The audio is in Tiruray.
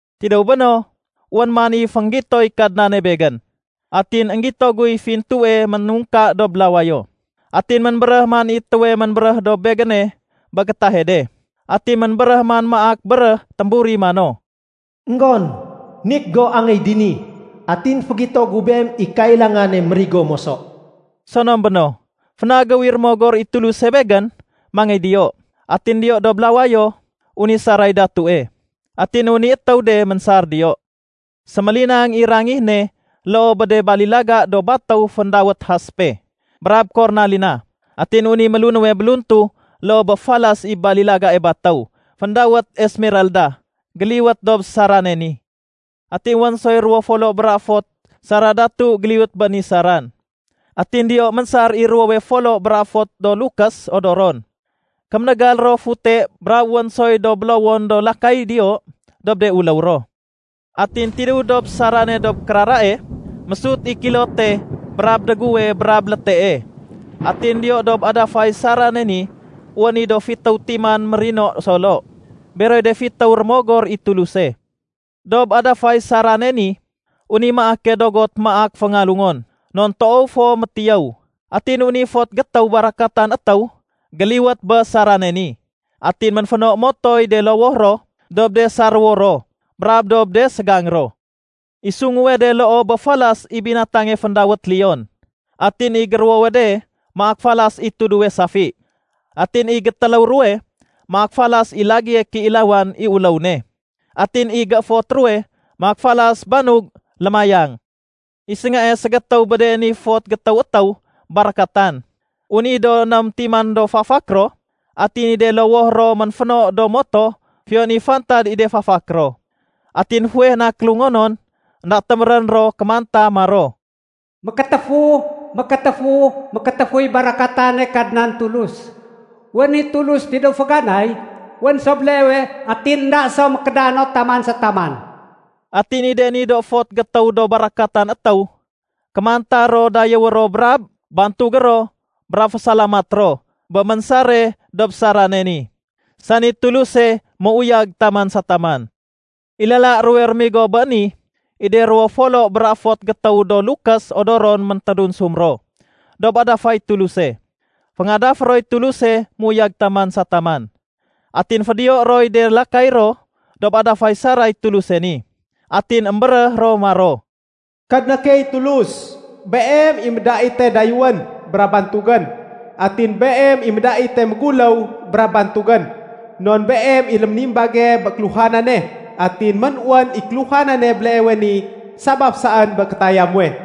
Tidéw béno, wén man i fénggitoy Kadnane begén. Atin énggito guy fintue ménungka dob lawayo. Atin ménbéréh man i étéwe ménbéréh dob begéne bé gétahe de. Atin ménbéréh man maak béréh témburi mano, “Enggon, nik go angéy dini, atin fégito gu beem i kailangane mérigo moso.” Sonom béno, fénagéw i Rémogor i Tuluse begén mangéy diyo. Atin diyo dob lawayo, wén i saray datue. Atin wén i étéw de ménsar diyo. Sémélinang i rangih ne loo bé de balilaga do batéw féndawét haspe brab kornalina. Atin wén i mélunéwe béluntu loo bé falas i balilagae batéw féndawét esmeralda géliwet dob sarane ni. Atin wén soy ruwo folo bra fot sara datu géliwét bé ni saran. Atin diyo ménsar i ruwowe folo bra fot do lukés odoron. Kéménégal ro fute brab wén soy do bélowon do lakay diyo dob de uléw ro. Atin tidéw dob sarane dob kérarae, mésut i kilote brab déguwe brab létee. Atin diyo dob adafay sarane ni, wén i do fitéw timan mérino solo. Beroy de fitéw rémogor i Tuluse. Dob adafay sarane ni, wén i maake dogot maak féngalungon non toow fo métiyéw. Atin wén i fot gétéw barakatan étéw géliwét bé sarane ni. Atin ménféno motoy de lowoh ro dob de saréwo ro brab dob de ségang ro. I sunguwe de loo bé falas i binatange féndawét leon. Atin i géruwowe de maak falas i tuduwe safi. Atin i gétéléw ruwe maak falas i lagéye kéilawan i uléw ne, atin i gééfot ruwe maak falas banug lémayang. I séngae ségétéw bé de ni fot gétéw étéw barakatan, wén i do ném timan do fafak ro, atin i de lowoh ro ménféno do moto fiyon i fantad i de fafak ro. Atin fuweh na kélungonon, énda témérén ro kémanta maro, “Mékétéfu, mékétéfu, mékétéfuy barakatane Kadnan Tulus. Wénén i Tulus tidéw féganay, wén so béleewe, atin énda so mékédano taman sa taman.” Atin i de ni do fot gétéw do barakatan étéw, kémanta ro dayéwé ro brab bantugé ro brab fésalamat ro bé ménsare dob sarané ni, sani Tuluse méuyag taman sa taman. I lala ruwe rémigo bé ni, i de ruwo folo bra fot gétéw do lukés odoron méntédunsum ro dob adafay Tuluse, féngadafé roy Tuluse méuyag taman sa taman. Atin fédiyoé roy de lakay ro dob adafay saray Tuluse ni, atin émbéréh ro maro, “Kadna key Tulus, Beem i médaite dayéwén brab bantugén. Atin Beem i médaite méguléw brab bantugén. Non Beem i léménimbage bé kéluhanane, atin ménwén i kéluhanane béleewe ni sabaf saén bé kétaya muwe.”